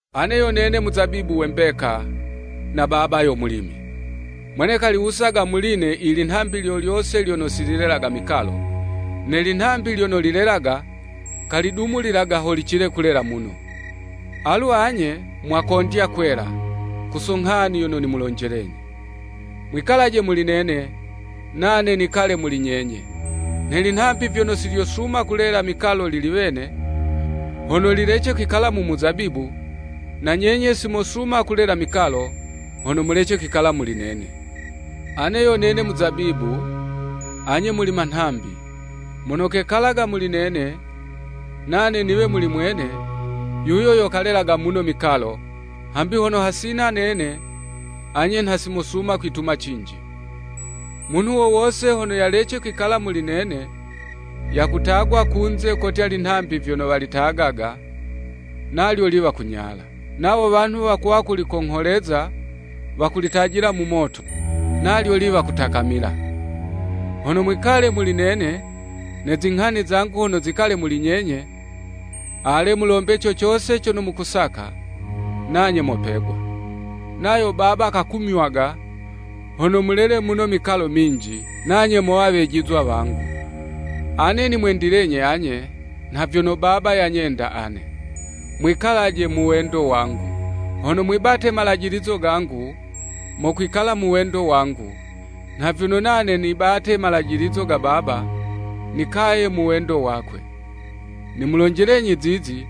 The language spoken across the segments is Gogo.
“Ane yo nene muzabibu we mbeka, na Baba yo mulimi. Mwene kaliwusaga muli'ne ilinhambi lyo lyose lyono si lilelaga mikalo, ne linhambi lyono lilelaga, kalidumulilaga ho licile kulela muno. Alu anye mwakondya kwela, ku so nghani yono nimulonjelenyi. Mwikalaje muli nene, nane nikale muli nyenye. Nhe linhambi vyono si lyosuma kulela mikalo lili wene, hono lilece kwikala mu muzabibu, na nyenye si mosuma kulela mikalo, hono mulece kwikala muli nene. “Ane yo nene muzabibu, anye muli manhambi. Mono kekalaga muli nene, nane niwe muli mwene, yuyo yo kalelaga muno mikalo, hambi hono hasina nene, anye nha si mosuma kwituma cinji. Munhu wo wose hono yalece kwikala muli nene, yakutagwa kunze kotya linhambi vyono walitagaga, nalyo liwa kunyala. Nawo wanhu wakuwa kulikongholeza, wakulitajila mu moto, nalyo liwa kutakamila. Hono mwikale muli nene ne zinghani zangu hono zikale muli nyenye, ale, mulombe co cose cono mukusaka, nanye mopegwa. Nayo Baba kakumywaga, hono mulele muno mikalo minji, nanye mowa wejizwa wangu. Ane nimwendilenyi anye, nha vyono Baba yanyenda ane. Mwikalaje mu wendo wangu. Hono mwibate malajilizo gangu, mokwikala mu wendo wangu, nha vyono nane nibate malajilizo ga Baba, nikaye mu wendo wakwe. Nimulonjelenyi zizi,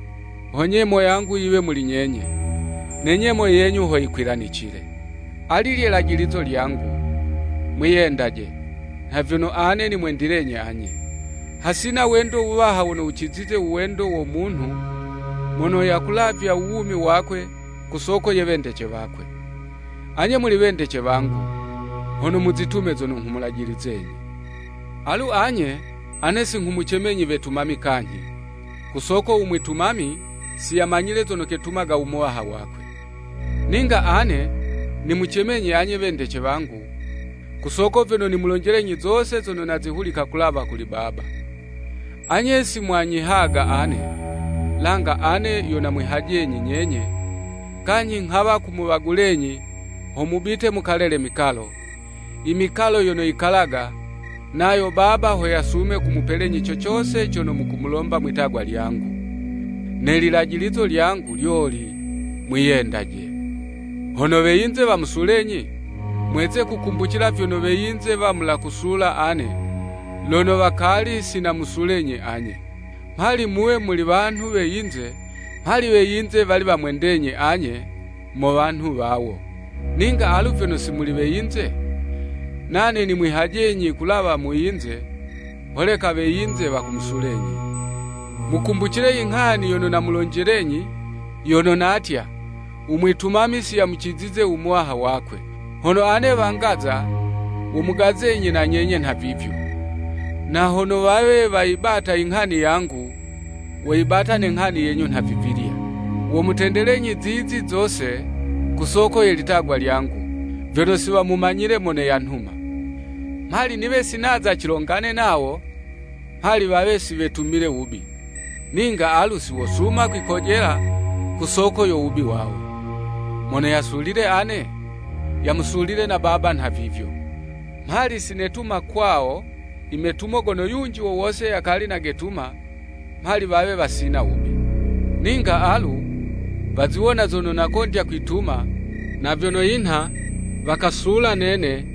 ho nyemo yangu yiwe muli nyenye, ne nyemo yenyu ho yikwilanicile. Ali lye lajilizo lyangu, mwiyendaje, nha vyono ane nimwendilenyi anye. Hasina wendo wuwaha wono wucizize u wendo wo munhu, mono yakulavya u wumi wakwe, ku soko ye wendece wakwe. Anye muli wendece wangu, hono muzitume zono nghumulajilizenyi. Alu anye, ane si nghumucemenyi wetumami kanyhi, ku soko u mwitumami, si yamanyile zono ketumaga u muwaha wakwe. Ninga ane nimucemenyi anye wendece wangu, ku soko vyono nimulonjelenyi zose zono nazihulika kulawa kuli Baba. Anye si mwanyihaga ane, langa ane yo namwihajenyi nyenye, kanyhi nghawa kumuwagulenyi ho mubite mukalele mikalo, i mikalo yono yikalaga, nayo Baba ho yasume kumupelenyi co cose cono mukumulomba mwitagwa lyangu. Ne lilajilizo lyangu, lyoli, mwiyendaje. “Hono we yinze wamusulenyi, mweze kukumbucila vyono we yinze wamula kusula ane, lono wakali si namusulenyi anye.” Mhali muwe muli wanhu we yinze, mhali we yinze wali wamwendenyi anye mo wanhu wawo. Ninga alu vyono si muli we yinze, nane nimwihajenyi kulawa mu yinze, holeka we yinze wakumusulenyi. Mukumbucile inghani yono namulonjelenyi, yono natya, “U mwitumami si yamucizize u muwaha wakwe.” Hono ane wangaza, womugazenyi na nyenye nhavivyo. Na hono wawe wayibata inghani yangu, woyibata ne nghani yenyu nhavivilya. Womutendelenyi zizi zose ku soko ye litagwa lyangu, vyono si wamumanyile mono yanhuma. Mhali niwe si naza cilongane nawo, mhali wawe si wetumile wubi, ninga alu si wosuma kwikojela ku soko yo wubi wawo. Mono yasulile ane, yamusulile na Baba nhavivyo. Mhali si netuma kwawo imetumo gono yunji wo wose yakali nagetuma, mhali wawe wasina wubi. Ninga alu, waziwona zono nakondya kwituma, na vyono yinha, wakasula nene,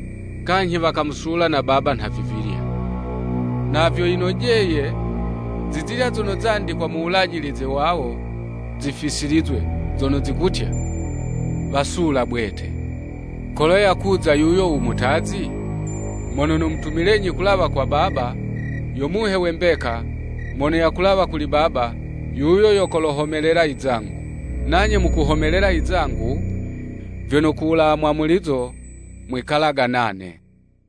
kanyhi wakamusula na Baba nhavivilya. Na vyo yinojeye, zizilya zono zandikwa mu Wulajilize wawo zifisilizwe, zono zikutya, “Wasula bwete. “Kolo yakuza yuyo u Mutazi, mono nomutumilenyi kuwulawa kwa Baba, yo Muhe we mbeka, mono yakulawa kuli Baba, yuyo yo kolohomelela izangu. Nanye mukuhomelela izangu, vyono kuwulawa mwamulizo, mwikalaga nane.